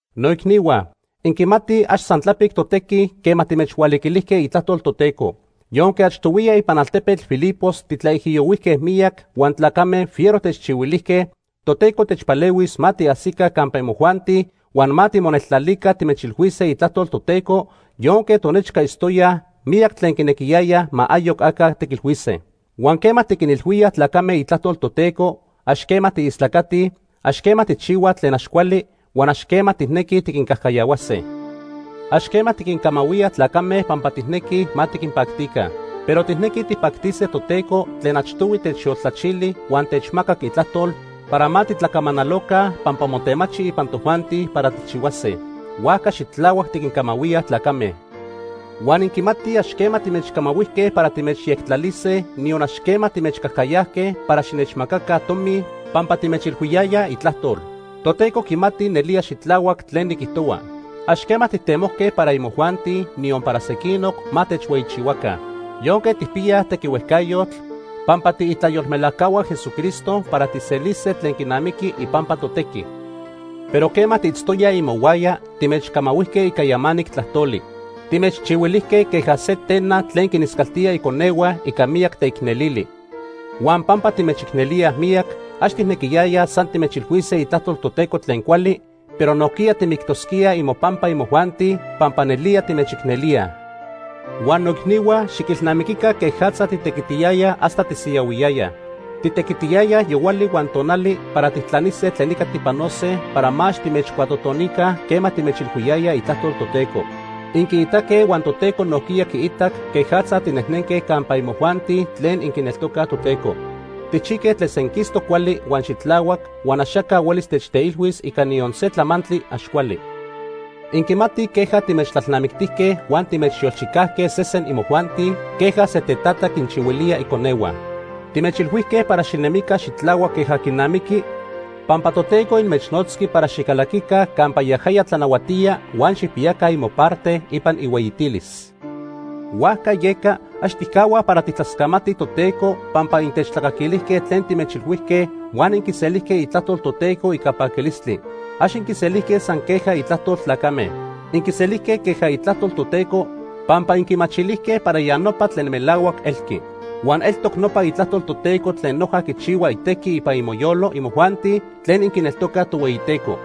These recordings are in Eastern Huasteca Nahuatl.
Noicnihua, inquimatij ax san tlapic totequi quema timechhualiquilijque itlajtol Toteco. Yonque achtohuiya ipan altepetl Filipos titlaijiyohuijque miyac huan tlacame fiero techchihuilijque, Toteco techpalehuis ma tiajsica campa imojuanti huan ma timoneltlalica timechilhuise itlajtol Toteco yonque tonechca itztoyaj miyac tlen quinequiyayaj ma ayoc aca tiquilhuise. Huan quema tiquinilhuíaj tlacame itlajtol Toteco, ax quema tiistlacatij, ax quema tijchihuaj tlen ax cuali, huan ax quema tijnequij tiquincajcayahuase. Ax quema tiquincamahuíaj tlacame pampa tijnequij ma tiquinpactica. Pero tijnequij tijpactise Toteco tlen achtohui techyoltlachili huan techmacac itlajtol para ma titlacamanaloca pampa motemachi ipan tojuanti para tijchihuase. Huajca xitlahuac tiquincamahuíaj tlacame. Huan inquimatij ax quema timechcamahuijque para timechyectlalise, niyon ax quema timechcajcayajque para xinechmacaca tomi pampa timechilhuiyayaj itlajtol. Toteco quimati nelía xitlahuac tlen niquijtohua. Ax quema tijtemojque para imojuanti, niyon para sequinoc, ma techhueyichihuaca. Yonque tijpiyaj tequihuejcayotl pampa tiitlayolmelajcahua Jesucristo para tijselise tlen quinamiqui ipampa totequi. Pero quema tiitztoyaj imohuaya, timechcamahuijque ica yamanic tlajtoli. Timechchihuilijque queja se tena tlen quiniscaltía iconehua ica miyac teicnelili. Huan pampa timechicnelíaj miyac, ax tijnequiyayaj san timechilhuise itlajtol Toteco tlen cuali, pero nojquiya timictosquíaj imopampa imojuanti, pampa nelía timechicnelíaj. Huan noicnihua, xiquilnamiquica quejatza titequitiyayaj hasta tisiyahuiyayaj. Titequitiyayaj yohuali huan tonali para tijtlanise tlen ica tipanose para ma ax timechcuatotonica quema timechilhuiyayaj itlajtol Toteco. Inquiitaque huan Toteco nojquiya quiitac quejatza tinejnenque campa imojuanti tlen inquineltocaj Toteco. Tijchijque tlen senquistoc cuali huan xitlahuac, huan axaca huelis techteilhuis ica niyon se tlamantli ax cuali. Inquimatij queja timechtlalnamictijque huan timechyolchicajque sesen imojuanti queja se tetata quinchihuilía iconehua. Timechilhuijque para xinemica xitlahuac queja quinamiqui pampa Toteco inmechnotzqui para xicalaquica campa yajaya tlanahuatía huan xijpiyaca imoparte ipan ihueyitilis. Huajca yeca, ax tijcahuaj para tijtlascamatij Toteco pampa intechtlacaquilijque tlen timechilhuijque huan inquiselijque itlajtol Toteco ica paquilistli. Ax inquiselijque san queja itlajtol tlacame. Inquiselijque queja itlajtol Toteco pampa inquimachilijque para ya nopa tlen melahuac elqui. Huan eltoc nopa itlajtol Toteco tlen noja quichihua itequi ipan imoyolo imojuanti tlen inquineltocaj Tohueyiteco.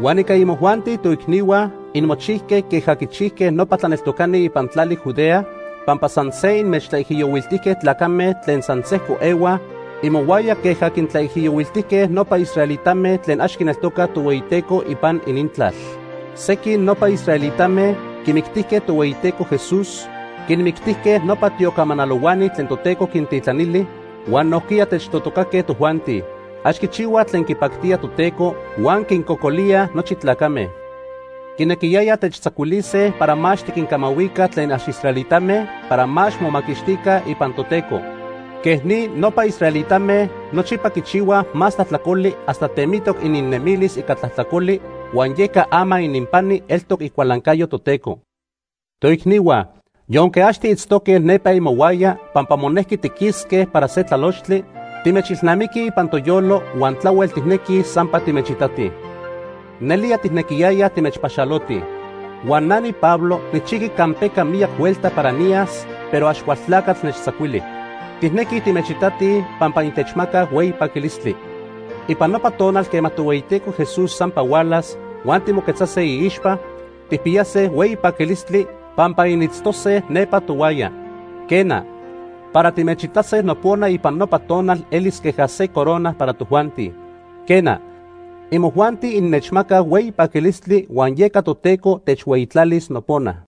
Huan ica imojuanti, toicnihua, inmochijque queja quichijque nopa tlaneltocani ipan tlali Judea, pampa san se inmechtlaijiyohuiltijque tlacame tlen san sejco ehuaj imohuaya queja quintlaijiyohuiltijque nopa israelitame tlen ax quineltocaj Tohueyiteco ipan inintlal. Sequin nopa israelitame quimictijque Tohueyiteco Jesús, quinmictijque nopa tiocamanalohuani tlen Toteco quintitlanili, huan nojquiya techtojtocaque tojuanti. Ax quichihuaj tlen quipactía Toteco huan quincocolíaj nochi tlacame. Quinequiyayaj techtzacuilise para ma ax tiquincamahuica tlen ax israelitame para ma ax momaquixtica ipan Toteco. Quej ni, nopa israelitame nochipa quichihuaj más tlajtlacoli hasta temitoc ininnemilis ica tlajtlacoli, huan yeca ama ininpani eltoc icualancayo Toteco. Toicnihua, yonque ax tiitztoque nepa imohuaya pampa monejqui tiquisque para se tlalochtli, timechilnamiquij ipan toyolo huan tlahuel tijnequij sampa timechitatij. Nelía tijnequiyayaj timechpaxalotij. Huan na niPablo nijchijqui campeca miyac huelta para niyas, pero Axcualtlacatl nechtzacuili. Tijnequij timechitatij pampa intechmacaj hueyi paquilistli. Ipan nopa tonal quema Tohueyiteco Jesús sampa hualas, huan timoquetzase iixpa, tijpiyase hueyi paquilistli pampa initztose nepa tohuaya. Quena, para timechitase nopona ipan nopa tonal elis queja se corona para tojuanti. Quena, imojuanti innechmacaj hueyi paquilistli huan yeca Toteco techhueyitlalis nopona.